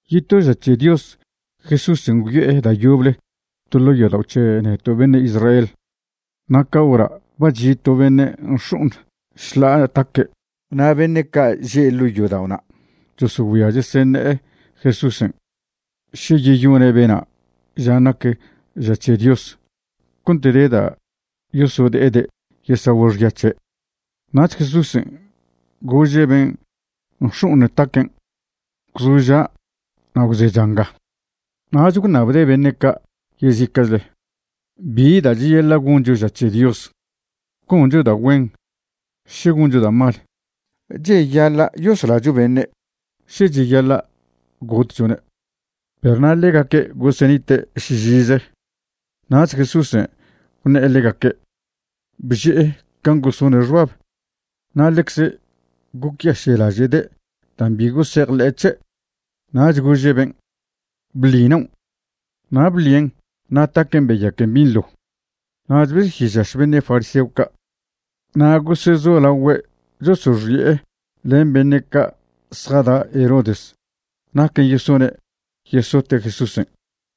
Yeto ža c̱he Dios Jesúsen' gwyo'e da' yoble to ḻo' yodao' c̱he neto' beṉe' Israel na' ca hora' ba chi' to beṉe' nx̱o'oṉ šḻa'a taque'. Na' beṉe' ca' že' ḻo' yodao'na' chosogüia cheseṉe'e Jesúsen' še yeyone' bena' žan' nac ža c̱he Dios cont de da' yosode'ede' yesagüe' xya c̱he'. Nach Jesúsen' gože' ben' nx̱o'oṉ taquen': ―Gwzoža' na' gwzecha nga. Nach gwṉabde' beṉe' ca' yezica'chle: ―¿Bi da' cheyaḻa' goncho ža c̱he Dios? ¿Goncho da' güen, še goncho da' mal? ¿Cheyaḻa' yoslacho beṉe', še cheyaḻa' gotchone'? Perw na' ḻegaque' gosenite' šižize. Nach Jesúsen' gwṉe'e ḻegaque', bže'e can' gosone' xbab, na' ḻecze gocyaše'laže'de' dan' bi gosejḻe'e c̱he', nach gože' ben': ―Bḻi naon'. Na' bḻien', na' taquen' beyaquen binḻo. Nach besyežaš beṉe' fariseo ca' na' gosezolagüe' chosoxi'e len beṉe' ca' zjada' Herodes naquen' yesone' yesote' Jesúsen'.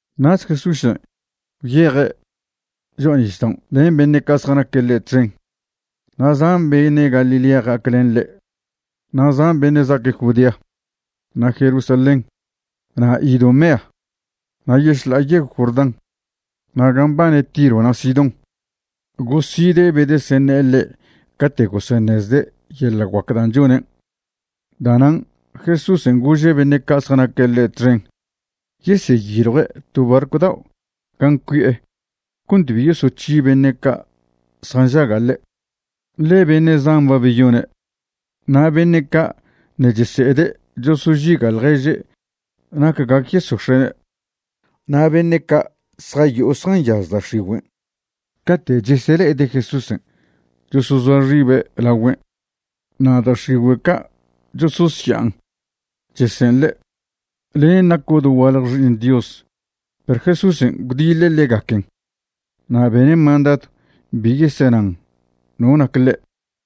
Nach Jesúsen' gwyeje' cho'a nisdaon' len beṉe' ca' zjanaque' ḻe' txen, na' zan beṉe' Galilea ja'ac len ḻe'. Na' zan beṉe' za'aque' Judea, na' Jerusalén, na' Idumea, na' yešḻa'a yegw Jordán, na' gan' mbane Tiro na' Sidón goside' bedeseṉe'e ḻe' cate' goseṉezde' yeḻa' guac da' chonen'. Da'nan' Jesúsen' gože' beṉe' ca' zjanaque' ḻe' txen yeseyiljue' to barcw dao' gan' cuie' cont bi yosoc̱hi beṉe' ca' zjanžaga' ḻe', ḻe beṉe' zan ba beyone', na' beṉe' ca' ṉe' chese'ede' chosožiga' ḻježe' nac gac yesox̱e'ne'. Na' beṉe' ca' zjayo'o zjanyaz da' x̱igüen' cate' chesele'ede' Jesúsen' chosozoa xibe' lagüen' na' da' x̱igüe' ca' chososya'an chese'en ḻe': ―Len' naco' dogualje Xi'iṉ Dios. Perw Jesúsen' gwdiḻe' ḻegaquen na' bene' mandadw bi yesenan no nac ḻe'.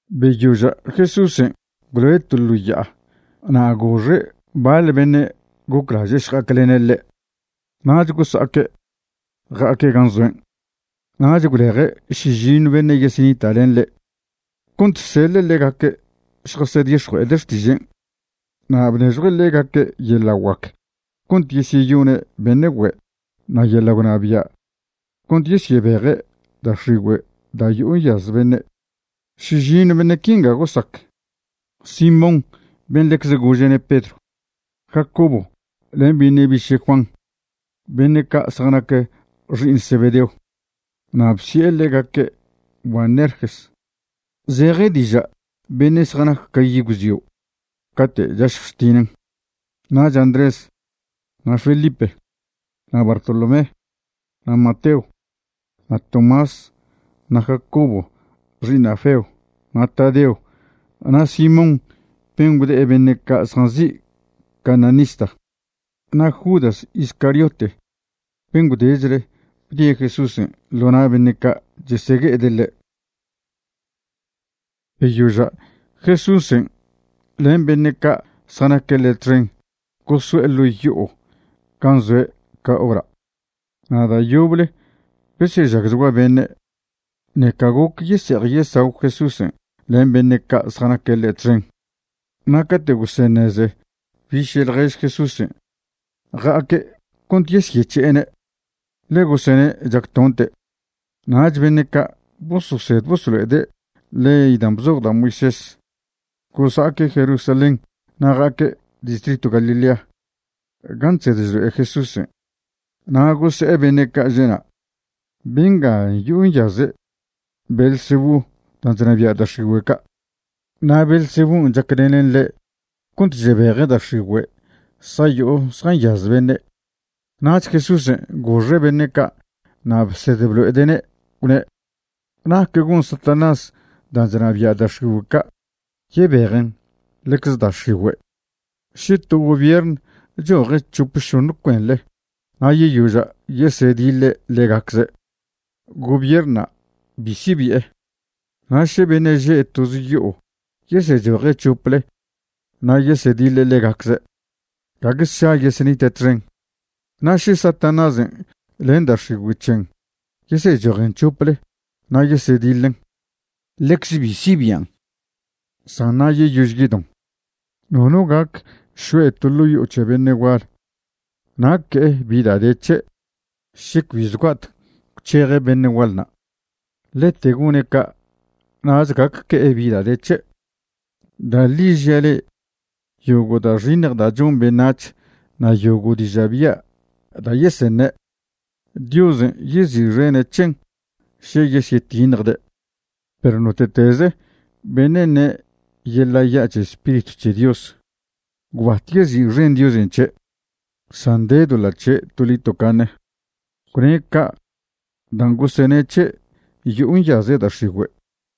Beyoža' Jesúsen' gwloe' to ḻo ya'a na' goxe' baḻ beṉe' goclaže' šja'aclene' ḻe', nach gosa'aque' ja'aque' gan' zoen'. Nach gwleje' šižiṉw beṉe' yesenita' len ḻe', cont seḻe' ḻegaque' šjasedix̱jue'ede' xtižen'. Na' bnežjue' ḻegaque' yeḻa' guac cont yesyeyone' beṉe' güe' na' yeḻa' gwnabia' cont yesyebeje' da' x̱igüe' da' yo'o nyaz beṉe'. Šižiṉw beṉe' quin' gosac: Simón ben' ḻecze gože'ne' Pedro; Jacobo len beṉe' biše' Juan beṉe' ca' zjanac xi'iṉ Zebedeo, na' bsi'e ḻegaque' Boanerges, zeje diža' beṉe' zjanac ca yi' gwzio' cate' chašjw chtinen; nach Andrés, na' Felipe, na' Bartolomé, na' Mateo, na' Tomás, na' Jacobo xi'iṉ Alfeo, na' Tadeo, na' Simón ben' gwde'e beṉe' ca' zjanzi' cananista, na' Judas Iscariote ben' gwdechle bdie' Jesúsen' ḻo na' beṉe' ca' chesegue'ede' ḻe'. Beyoža' Jesúsen' len beṉe' ca' zjanaque' ḻe' txen goso'e ḻo' yo'o gan' zoe' ca hora', na' da' yoble besežagchgua beṉe', ṉeca goc yese'ej yesagw Jesúsen' len beṉe' ca' zjanaque' ḻe' txen. Na' cate' goseṉeze biše' ḻjež Jesúsen', ja'aque' cont yesyec̱he'ene', ḻe gosene' chactonte'. Nach beṉe' ca' bososed bosolo'ede' ley dan' bzoj da' Moisés gosa'aque' Jerusalén na' ja'aque' distritw Galilea gan' chsed chlo'e Jesúsen' na' gose'e beṉe' ca' že'na': ―Benga yo'o nyaze' Beelzebú dan' chnabia' da' x̱igüe' ca', na' Beelzebún' chaclenen ḻe' cont chebeje' da' x̱igüe' zjayo'o zjanyaz beṉe'. Nach Jesúsen' goxe' beṉe' ca' na' bsed blo'ede'ne' gwne': ―¿Nac gon Satanás dan' chnabia' da' x̱igüe' ca' yebejen ḻecze da' x̱igüe'? Še to gobierṉ choje' c̱hop šoṉ cuenḻe na' yeyoža' yesediḻe ḻegacze', gobierṉna' bi sibi'e. Na' še beṉe' že' toz yo'o yesechoje' c̱hople na' yesediḻe ḻegacze', gague sša yesenite' txen. Na' še Satanásen' len da' x̱igüe' c̱hen yesechojen c̱hople na' yesediḻen, ḻecze bi sibian', san na' yeyož yedon. ’Nono gac šo'e ḻo' yo'o c̱he to beṉe' gual na' que'e bi da' de c̱he' še cbi zgua'tec gwc̱heje' beṉe' gual na', ḻete gone' ca' nach gac que'e bi da' de c̱he'. ’Da' ḻi žia' le'e, yogo' da' xiṉj da' chon beṉac̱h na' yogo' diža' bya' da' yeseṉe', Diosen' yezi'xene' c̱hen še yesyetiṉjde'. Perw note'teze beṉe' ṉe' yeḻa' ya' c̱he Spiritw c̱he Dios, gwbat yezi'xen Diosen' c̱he', san de doḻa' c̱he' toḻi tocaṉe. Gwne' ca' dan' gosene' c̱he' yo'o nyaze' da' x̱igüe'.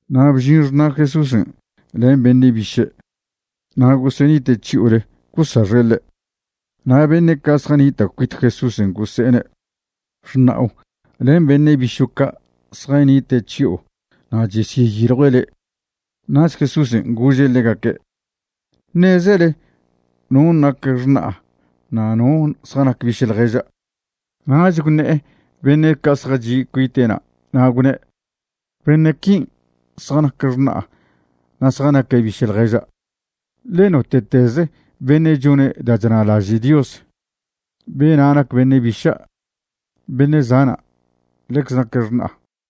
Na' bžin xṉa' Jesúsen' len beṉe' biše', na' gosenite' chyo'ole gosaxe' ḻe'. Na' beṉe' ca' zjanita' cuit Jesúsen' gose'ene': ―Xṉa'o len beṉe' bišo' ca' zjanite' chyo'o na' chesyeyiljue' le'. Nach Jesúsen' gože' ḻegaque': ―¿Ṉezele non' nac xṉa'a na' no zjanac biše' ḻježa'? Nach gwṉe'e beṉe' ca' zjachi' cuite'na', na' gwne': ―Beṉe' quin' zjanac xṉa'a na' zjanaque' biše' ḻježa'. Ḻe note'teze beṉe' chone' da' chna'laže' Dios, bena' nac beṉe' biša', beṉe' zana', ḻecze naque' xṉa'a.